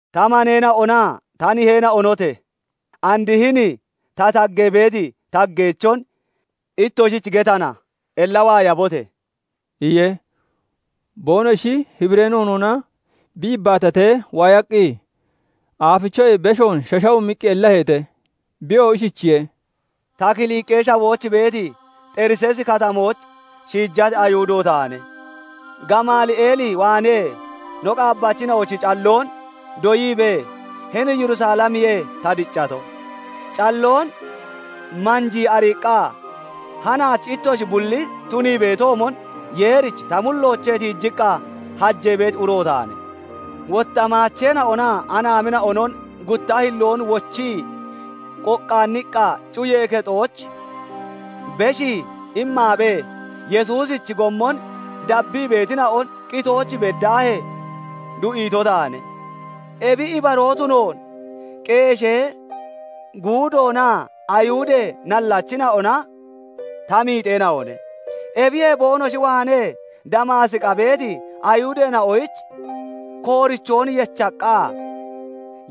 "Ta maneena'onaa ta niheena'onote! And hini ta taggee beeti taggeechon ittoshich getana; ella waayabote!" iye. Boonoshi Hibiree noonoona bi yibbaatatee waayaqqi, aafichoyee beshoon shashawumiqqi ellaheete. Biyoo ishichiye:- "Ta Kiliqee Shawooch beeti Xeriseesi Katamooch shiijati Ayihudo taane; Gamali'eel waanee no qaabbachina'ochi calloon doyiibee, hini Yerusalemiyee ta diccato; calloon manjii ariiqqa, hanaach ittoshi bulli tunii beetoomon Yeerich ta mulloochee tiijiqqa hajee beeti uro taane. Wotta maacheena'onaa anaamina'onon gutta hilloon wochii qoqqaanniqqa cuyee kexooch beshii immaabee, Yesuusichi gommon dabbii beetina'on qitooch beddaahee du'iito taane. Ebi ibaroo tunoon qeeshee guudoonaa Ayihudee nallachina'ona ta miixeena'one. Ebiyee boonoshi waanee Damaasiqa beeti Ayihudeena'oyich koorichoon yechaqqa,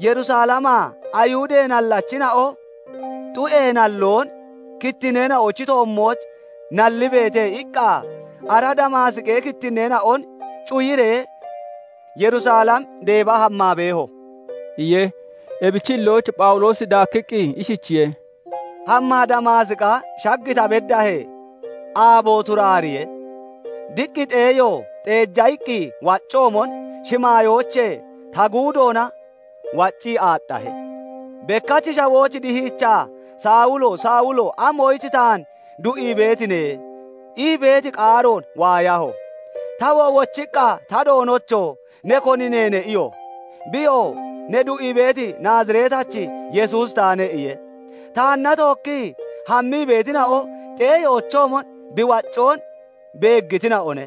'Yerusalemaa Ayihudee nallachina'o xu'ee nalloon kittinneena'ochi toommooch nallibeete' iqqa, ara Damaasiqi kittinneena'on cuyiree, Yerusalem deeba hammaa beeho" iye. Ebichi hillooch Phawuloosi daakkiqqi ishichiye:- "Hammaa Damaasiqa shag ta beddaahee, aabo turaariyee, diq xeeyo xeeja iqqi waccoomon, shimaayoochee ta guudoona waccii aaxxahe. Bekkach shawooch dihiichaa, 'Sawulo! Sawulo! Amoyich taan du'ii beetine?' ii beeti qaaroon waayaho. "Tawoo wochiqqa, 'Ta Doonocho! ne koni neene?' iyo. "Biyoo 'Ne du'ii beeti Naaziretachi Yesuusi taane' iye. Taanna tookkii hammii beetina'o xeeyoochoomon bi waaccoon beeggitina'one;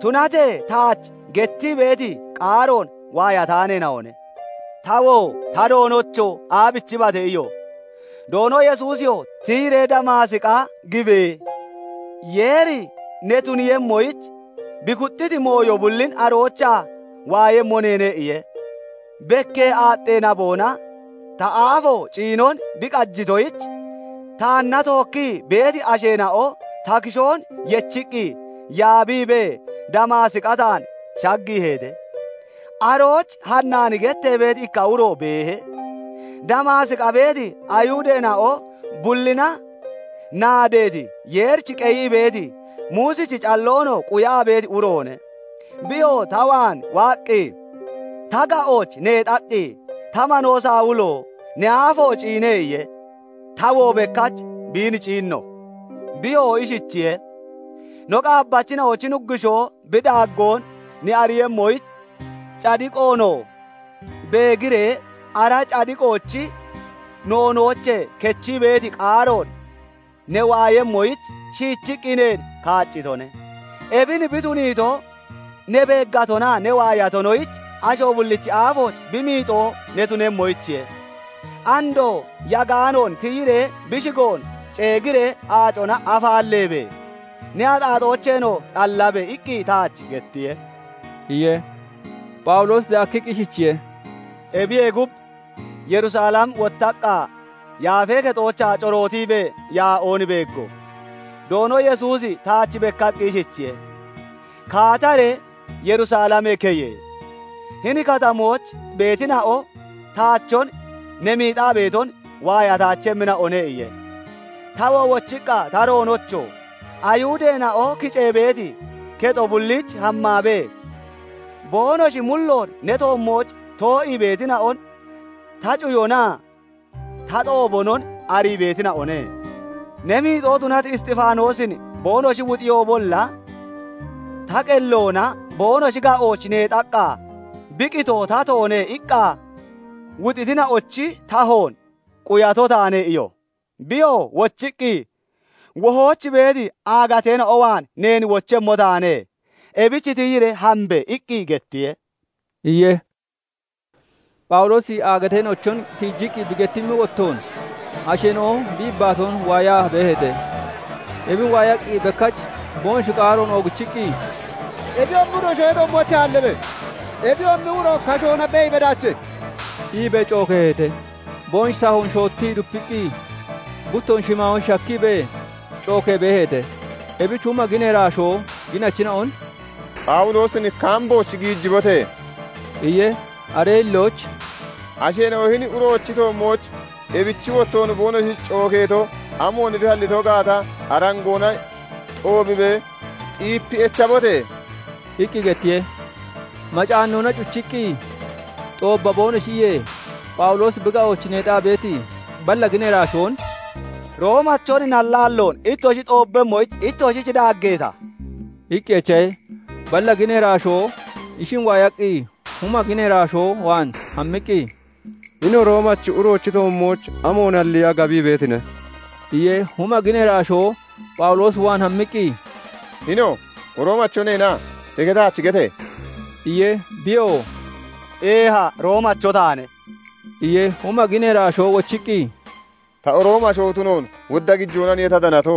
tunatee taach gettii beeti qaaroon waayataaneena'one. "Tawoo 'Ta Doonocho! Aabichibate?' iyo. "Doono Yesuusiyoo 'Tiyiree Damaasiqia gibe! Yeeri ne tuniiyemmoyich bi kuxxiti mooyo bullin aroochaa waayemmo neene' iye. "Bekkee aaxxee naboona ta aafo ciinon bi qajitoyich, taanna tookkii beeti asheena'o ta kishoon yechiqqi yaabiibee, Damaasiqa taan shaggiiheete. "Arooch Hanaani gettee beeti ikka uro beehe; Damaasiqa beeti Ayihudeena'o bullina naadeeti, Yeerich qeyii beeti, Muusichi calloonoo quyaa beeti uroone. Biyoo ta waan waaqqi ta ga'ooch neexaqqi, 'Ta manoo Sawulo! Ne aafo ciine!' iye. Tawoo bekkach biin ciinno. "Biyoo ishichiye:- 'No qaabbachina'ochi Nuggushoo bi daaggoon ne ariiyemmoyich, cadiqoonoo beegiree ara cadiqoochi noonoochee kechii beeti qaaroon ne waayemmoyich, shiichiqqi neen kaaccitone; ebin bi tuniito, ne beeggatonaa ne waayatonoyich asho bullichi aafooch bi miixoo ne tunemmoyichiye. Andoo yagaanoon tiyiree bi shigoon ceegiree, aacona afaalleebe! Ne axaaxoocheenoo xallabe!' iqqi taach gettiye" iye. Phawuloosi daakkiqqi ishichiye:- "Ebiyee gub Yerusalem wottaqqa, Yaafee Kexoochaa corootiibee yaa'oon beeggo; Doono Yesuusi taach bekkaqqi ishichiye:- 'Kaataree Yerusalemee keye! Hini katamooch beetina'o taachon ne miixaa beeton waayataachemmina'one' iye. "Tawoo wochiqqa, 'Ta Doonocho! Ayihudeena'o kicee beeti kexo bulliich hammaabee, boonoshi mulloon ne toommooch too'ii beetina'on ta cuyonaa ta xoobonon arii beetina'one; ne miixoo tunati Isxifaanoosin boonoshi wuxiyoobolla, ta qelloona boonoshi ga'ooch neexaqqa, "Bi qitoo tatoone" iqqa wuxitina'ochi tahoon quyato taane' iyo. "Biyoo wochiqqi, 'Wohooch beeti aagateena'o waan neen wochemmo taane; ebich tiyiree hambe!' iqqi gettiye" iye. Phawuloosi aagateena'ochon tiijiqqi bi gettimmi wottoon, asheena'o bi yibbaatoon waayaa beeheete; ebin waayaqqi bekkach boonoshi qaaroon oogichiqqi, "Ebiyoomi uro shawee toommoochee aallabe! Ebiyoomi uro kashoona beeyi bedaache!" iibee cookeeheete. Boonoshi tahoon shoottii dupiqqi, buttoon shimaayooch shakkiibee, cookee beeheete; ebich huma ginee iraashoo ginachina'on "Phawuloosin kaambooch giijibote!" iye. Aree hillooch "Asheena'o hini uroochi toommooch ebichi wottoon boonoshi cookeeto, amoon bi aalliito gaata, arangoona xoobibee xiipi echabote!" iqqi gettiye. Macaannoona cuchiqqi xoobba boonoshi iyee, Phawuloosi bi ga'ooch neexaa beeti balla ginee iraashoon "Roomachon nallaalloon ittoshi xoobbemmoyich, ittoshich daaggeeta?" iqqi echahe. Balla ginee iraashoo ishin waayaqqi, huma ginee iraashoo waan hammiqqi, "Hini Roomachi uroochi toommooch amoon halliya gabii beetine? iye. Huma ginee iraashoo Phawuloos waan hammiqqi, "Hino, Roomacho neena? Eke taach gete!" iye. Biyoo "Eeha Roomacho taane" iye. Huma ginee iraashoo wochiqqi, "Ta Roomi asho tunoon wodda gijoonaniye ta danato"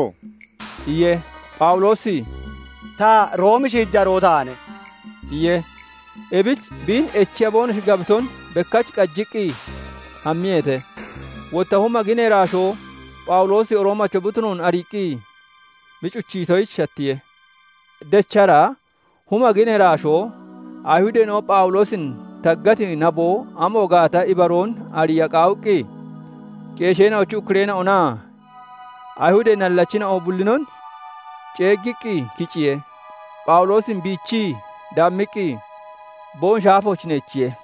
iye. Phawuloosi "Ta Roomi shiijaroo taane" iye. Ebich biin echiya boonoshi gabiton bekkach qajiqqi hammiyeete; wotta huma ginee irashoo Phawuloosi Roomacho bi tunoon ariiqqi bi cuchiitoyich shattiye. Dechara huma ginee iraashoo Ayihudeena'o Phawuloosin taggati naboo amo gaata ibaroon ariya qaawiqqi, qeesheena'ochi ukkureena'onaa Ayihudee nallachina'o bullinon ceeggiqqi kiciye; Phawuloosin biichii, daammiqqi boonoshi aafooch neechiye.